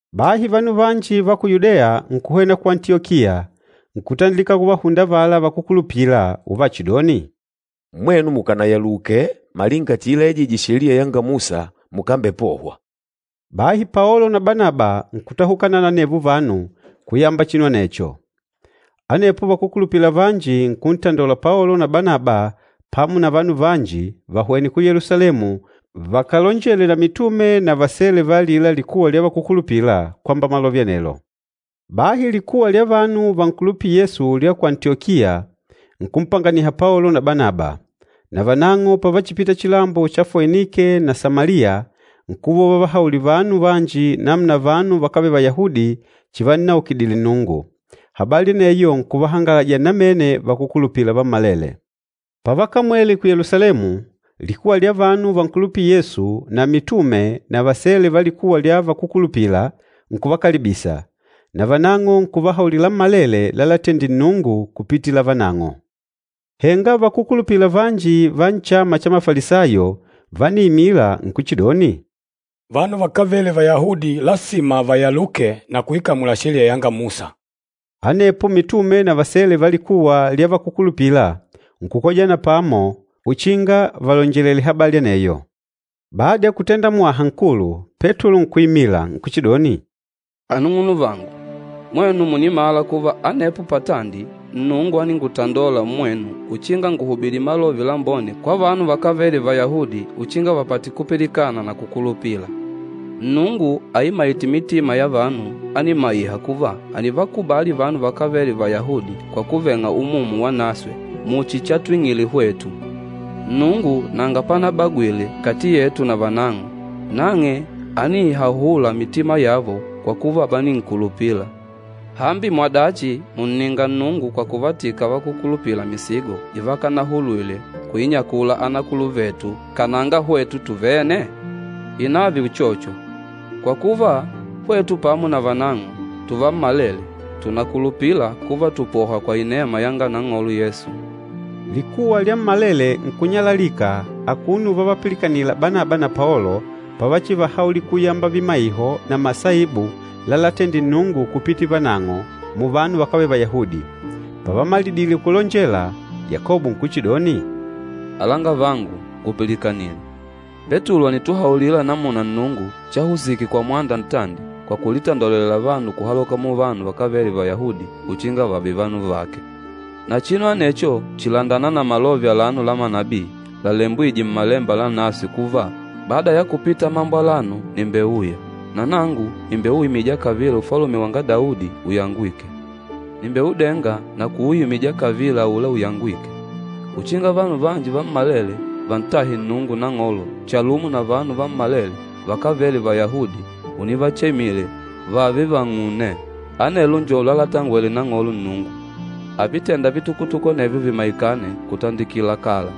Bahi vanu vanji va ku Yudeya nkuhwena ku Antiyokiya, nkutandilika kuvahunda avala vakúkulupila uvachidoni, “Mwenu mukànayaluke malinga chiilaijije Sheliya yanga Musa mukambepohwa.” Bahi Paolo na Banaba nkutahukana na anevo vanu kuyamba chinu anecho. Anepo vakúkulupila vanji nkuntandola Paolo na Banaba pamo na vanu vanji vahwene ku Yelusalemu vakalonjele na mitume na vasele va alila likuwa lya vakúkulupila, kwamba malove anelo. Bahi likuwa lya vanu vankulupîla Yesu lya ku Antiyokiya nkumpanganiha Paolo na Banaba, na vanang'o pavachipita chilambo cha Foinike na Samaliya nkuva uvavahaulila vanu vanji namuna vanu vakávele Vayahudi chivannaukidile Nnungu. Habali aneyo nkuvahangaladya namene vakúkulupila vammalele. Pavakamwele ku Yelusalemu, likuwa lya vanu vankulupîla Yesu na mitume na vasele va likuwa lya vakúkulupila nkuvakalibisa, na vanang'o nkuvahaulila lammalele lalatendile Nnungu kupitila vanang'o. Henga vakúkulupila vanji va nchama cha Mafalisayo vániimila nkuchidoni, “Vanu vakávele Vayahudi lasima vayaluke na kuikamula Sheliya yanga Musa.” Anepo mitume na vasele va likuwa lya vakúkulupila nkukojana pamo uchinga valonjelele habali aneyo. Bada ya kutenda mwaha nkulu, Petulo nkuimila nkuchidoni, “Anung'unuvangu, mwenu mùnimala kuva, anepo patandi Nnungu áningutandola mmwenu uchinga nguhubili Malove Lambone kwa vanu vakávele Vayahudi uchinga vapate kupilikana na kukulupila. Nnungu aimaîte mitima ya vanu ánimaiha kuva ànivakubali vanu vakávele Vayahudi kwa kuveng'a Umumu Wanaswe muchi chatwing'ile hwetu. Nnungu nanga panabagwile kati yetu na vanang'o, nang'e ániihahula mitima yavo kwa kuva váninkulupila. Hambi mwadachi mùnninga Nnungu kwa kuvatika vakúkulupila misigo ivakanahulwile kuinyakula anakuluvetu kananga hwetu tuvene? Ìnave uchocho, kwa kuva, hwetu pamo na vanang'o tuvammalele tùnakulupila kuva tùpohwa kwa inema yanga Nang'olo Yesu.” Likuwa lyammalele nkunyalalika akuno uvavapilikanila Banaba na Paolo pavachivahaulila kuyamba vimaiho na masaibu lalatendile Nnungu kupitila vanang'o muvanu vakávele Vayahudi. Pavamalidile kulonjela, Yakobo nkuchidoni, “Alangavangu, ngupilikanile! Petulo ànituhaulila namuna Nnungu chahusike kwa mwanda ntandi kwa kulitandolela vanu kuhaloka muvanu vakávele Vayahudi uchinga vààve vanu vake. Na chinu anecho chìlandana na malove alano la manabii lalembwîje Mmalemba Lanaswe kuva, ‘Bada ya kupita mambo alano nìmbeuya, na nangu nìmbeuimija kavila ufalume wanga Daudi uyangwîke. Nìmbeudenga na kuuimija kavila aula uyangwîke, uchinga vanu vanji vammalele vantahe Nnungu Nang'olo chalumo na vanu vammalele vakávele Vayahudi univachemile vààve vang'une. Anelo njo lalatangwele Nang'olo Nnungu, avitênda vitukutuku anevyo, vímaikane kutandikila kala.’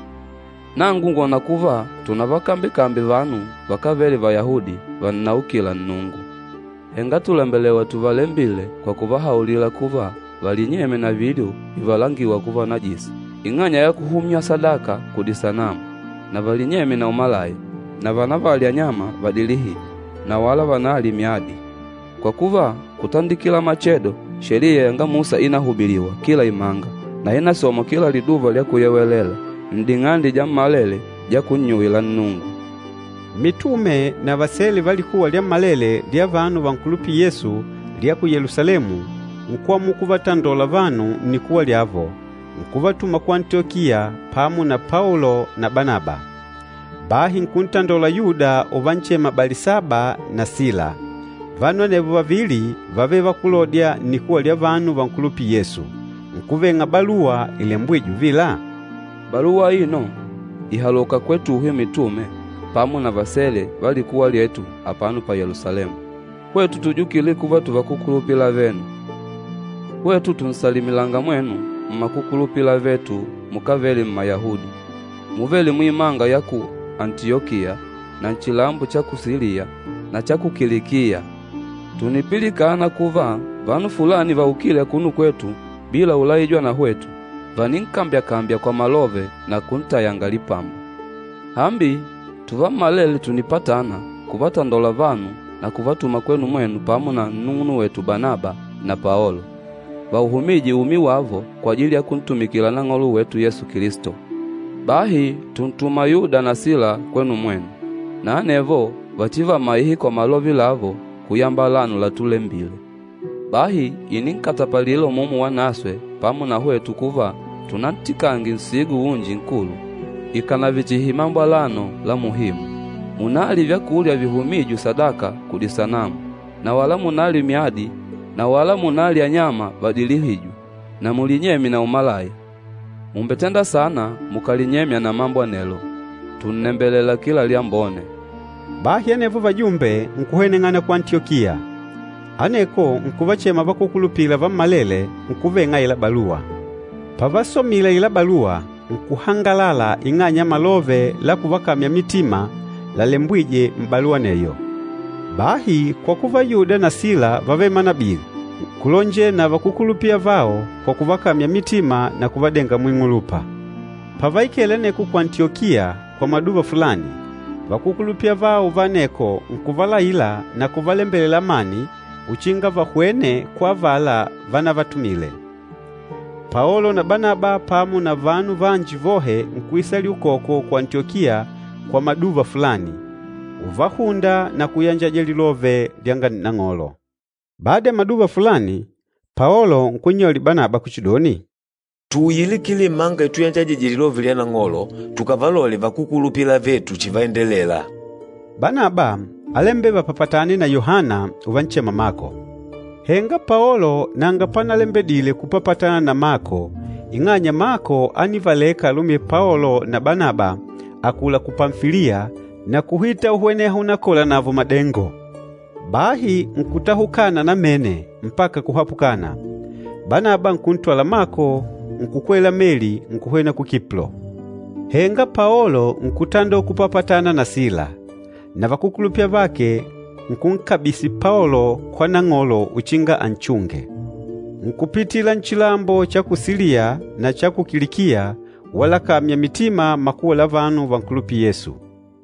Nangu ngwòna kuva tunavakambyekambye vanu vakávele Vayahudi vannaukîla Nnungu. Henga tùlembelewa tuvalembile kwa kuvahaulila kuva valinyemye na vilyo vivalangîwa kuva najisi ing'anya ya kuhumywa sadaka kudisanamu na valinyemye na umalaya na vanavalye anyama vadilihîjwe na wala vanalye myadi. Kwa kuva, kutandikila machedo Sheliya yanga Musa ínahubiliwa kila imanga na ínasomwa kila Liduva lya Kuyewelela n'ding'ande dyammalele dya kunnyuwila Nnungu.” Mitume na vasele va likuwa lyammalele lya vanu vankulupîla Yesu lya ku Yelusalemu nkwamula kuvatandola vanu nnikuwa lyavo, nkuvatuma ku Antiyokiya pamo na Paolo na Banaba. Bahi nkuntandola Yuda uvanchema Balisaba na Sila. Vanu anevo vavili vávele vakúlodya nnikuwa lya vanu vankulupîla Yesu. Nkuveng'a baluwa ilembwîje uvila, “Baluwa aino ìhaloka kwetuhwe mitume pamo na vasele va likuwa lyetu apano pa Yelusalemu, hwetu tujukîle kuva tuvakukulupila avenu. Hwetu tùnsalimilanga mwenu mmakukulupila avetu mukávele Mmayahudi, muvêle muimanga ya ku Antiyokiya na nchilambo cha ku Siliya na cha ku Kilikiya. Tùnipilikana kuva vanu fulani vaukîle akuno kwetu bila ulaijwa na hwetu, vàninkambyakambya kwa malove na kuntayanga lipamba. Hambi, tuvammalele tùnipatana kuvatandola vanu na kuvatuma kwenu mwenu pamo na nnung'unwetu Banaba na Paolo, vauhumîje umi wavo kwajili ya kuntumikila Nang'olo wetu Yesu Kilisto. Bahi tùntuma Yuda na Sila kwenu mwenu, na anevo vachivamaihe kwa malove lavo kuyamba alano latulembile. Bahi ìninkatapalila Umumu Wanaswe pamo na hwetu kuva tunantikange nsigo unji nkulu ikànave chihi mambo alano la muhimu, munalye vyakulya vihumîjwe sadaka kudisanamu na wala munalye myadi na wala munalye anyama vadilihîjwe na mulinyemye na umalaya. Mùmbetenda saana mukàlinyemya na mambo anelo. Tùnnembelela kila lyambone!” Bahi anevo vajumbe nkuhweneng'ana ku Antiyokiya. Aneko nkuvachema vakúkulupila vammalele nkuveng'a aila baluwa. Pavasomile aila baluwa, nkuhangalala ing'anya ya malove la kuvakamya mitima lalembwîje m'baluwa aneyo. Bahi kwa kuva Yuda na Sila vávele manabii, nkulonjela na vakúkulupila avao kwa kuvakamya mitima na kuvadenga muing'ulupa. Pavaikele aneko ku Antiyokiya kwa maduva fulani, vakúkulupila avao va aneko nkuvalaila na kuvalembelela amani uchinga vahwene kwa avala vanavatumile. Paolo na Banaba pamo na vanu vanji vohe nkuisalila ukoko ku Antiyokiya kwa maduva fulani, uvahùndà na kuyanjaja lilove lyanga Nang'olo. Bada ya maduva fulani, Paolo nkunnyaulila Banaba kuchidoni, “Tuuyile kila imanga ituyanjajije Lilove lyanga Nang'olo, tukavalole vakúkulupila avetu chivaendelela.” Banaba álembela vapapatane na Yohana uvanchema Mako. Henga Paolo nanga panalembedile kupapatana na Mako ing'anya Mako ánivaleka alumi Paolo na Banaba akula ku Pamfiliya na kuhita uhweneha unakola navo madengo. Bahi nkutahukana namene mpaka kuhapukana. Banaba nkuntwala Mako nkukwela meli nkuhwena ku Kiplo. Henga Paolo nkutandola kupapatana na Sila, na vakúkulupila avake nkunkabisi Paolo kwa Nang'olo uchinga anchunge. Nkupitila nchilambo cha ku Siliya na cha ku Kilikiya walakamya mitima makuwa la vanu vankulupîla Yesu.